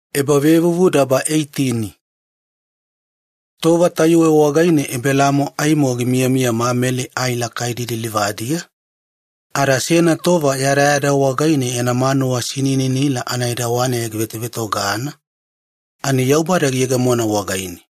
Wakawaka aditoto. Tova tayuwe wagaine Ebelaamo aimo gimiyamiya Mamele ai lakaidi lilivadiya, ada seyana tova yadayada wagaine yana manuwa sinininila anaedawaneya givetovetogana ani Yaubada giyegemo wagaine.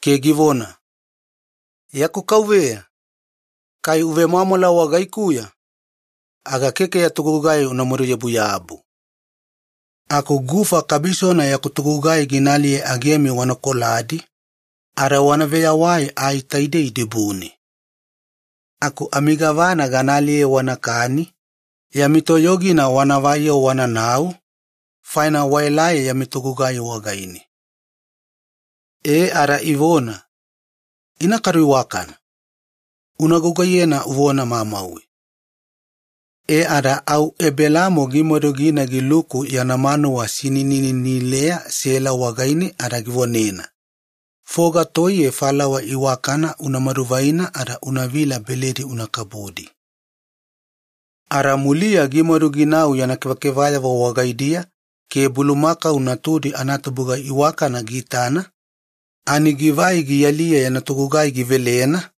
ada givona, “Yaku kauveya, kai wagaikuya ya nuwanuwa analauboda mamauwe, aga keke ya togugai unamadu yabuyabu. Aku gufa kabisona gana aliye matatabumi agemi wana koladi ke wana veyawai ai taidei dibune. Aku amigavana gana aliye wanakani, yami toyogina wanavai-yo wananau, faina waelai yami togugai wagaine.” Ada ivona, “Ina kadu iwaka-vagaina, una gugaiyena uvona mamauwe.” E ada au Ebelaamo gimadu gina giluku yana manuwa sinininileya Sela wagaine ada givonena, “Unamadu, foga toiye falawa iwakana unavila beledi una kabudi.” Ada muliya gimadu ginau yana kevakevayavo wagaidiya ke bulumakau natudi anatubuga iwakana giitana ani givai gialiye yana togugai givelena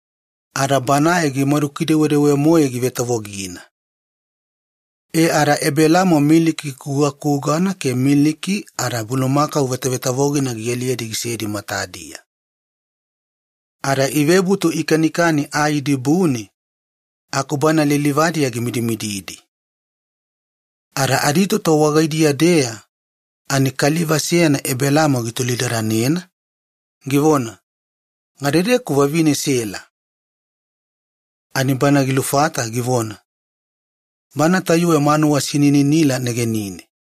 ada banae gimadukidewedewe-moe givetavogina. E ada Ebelaamo miliki kugakugana ke miliki ada bulumakau vetavetavogina gialiyedi gisedi matadiya. Ada ivebutu ikanikani ai dibune, aku bana lilivadiya gimidimididi. Ada aditoto wagaidiya-deya ani kaliva seyana Ebelaamo gitolidadanena, givona, “Gadedeku vavine Sela?” Ani gilufata givona, “Bana tayuwe manuwa sinininila negenine.”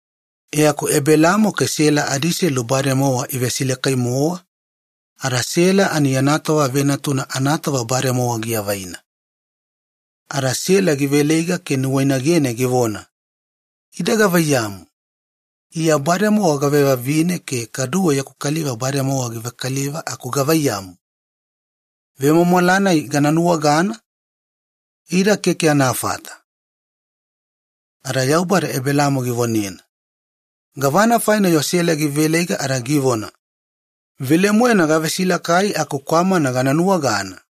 E aku Ebelaamo ke Sela adiiselu bademowa ivesilakai-mowa, ada Sela ani yana tova venatuna anatova bademowa giavaina. Ada Sela giveleiga ke nuwainagene givona, “Ida gavaiyamu, iya bademowa gavevavine ke kaduwe yaku kaliva bademowa givekaliva aku gavaiyamu, vemwamwala-nai gana nuwagana? Ida keke anafata.” Ada Yaubada Ebelaamo givonena, “Gavana faina-yo Sela giveleiga ada givona, 'Velemoena gavesilakai aku kwamana gana nuwagana?'”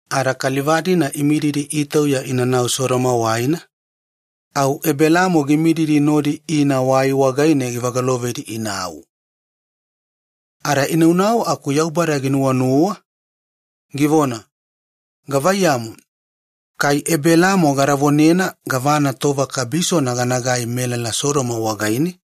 Tova-nai kaliva-dina imididi itauya inanau Sodoma waina, au Ebelaamo gimididi nodi ina waiya givagatunedi inau. Ada inaunau aku Yaubada ginuwanuwa ada givona, “Gilubodana gana vonena Ebelaamo gavana ganagai melala Sodoma wagaine.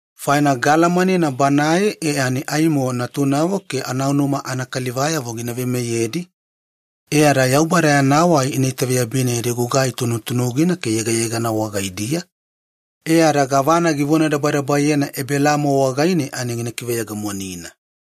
Faina gaalamanena banae e ani aimo natunavo ke anaunuma anakalivayavo gina veimeyedi. Yaubada yana wai ina itaveyabina yadi gugai tunutunugina ke yegayegana wagaidiya, e ada gavana givonadabadabayena Ebelaamo wagaine ani gina kiveyegemonina.”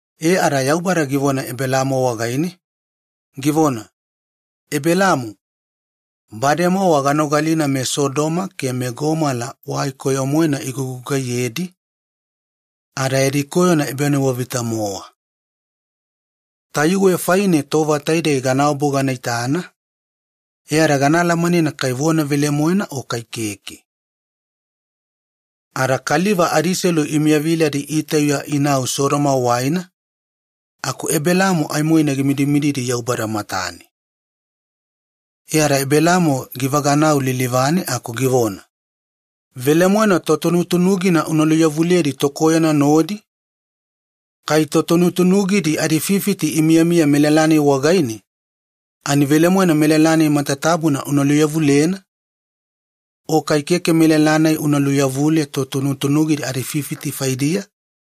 E, ada Yaubada givona Ebelaamo wagaine, “Ebelaamo, bademowa ganogalina meSodoma ke meGomola wai koyo-moena igugugaiyedi ada yadi koyona ebanuwavita-mowa. Tayuwe faine tova taidei ganaobu ganaitana ke gana alamanena vona velemoena kai keke.” Ada kaliva adiselu imiyaviladi itauya inau Sodoma waina aku Ebelaamo aimoina gimidimididi Yaubada matane. E ada Ebelaamo givaganau lilivane aku givona, “Velemoena totunutunugina una luveyawaliyedi tokoyona nodi? Gavaiyamu, kai totunutunugidi adififiti imiyamiya melala-nai wagaine ani velemoena una luveyawaliyena, o kai keke una luveyaweliye totunutunugidi adififiti faidiya?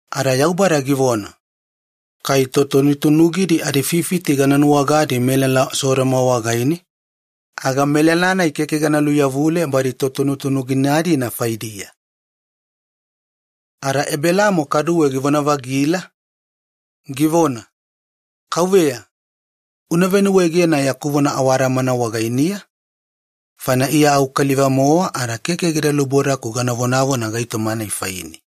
Ada Yaubada givona, “Kai totunutunugidi adififiti gana nuwagadi melala Sodoma wagaine, aga melala-nai keke gana luveyawaliye badi totunutunugina-dina faidiya.” Ada Ebelaamo kaduwe givona-vagila, givona, “Kauveya, una venuwaegena yaku vona awadamana wagainiya, faina iya au kaliva-mowa ada keke gida lubodaku gana vonavona gava gaitoma faine.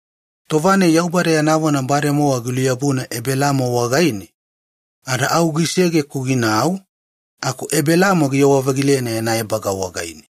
Tova-nai Yaubada yana vona bademowa giluyabuna Ebelaamo wagaine ada au gisege-ku ginau, aku Ebelaamo giyewa-vagilena yana ebaga wagaine.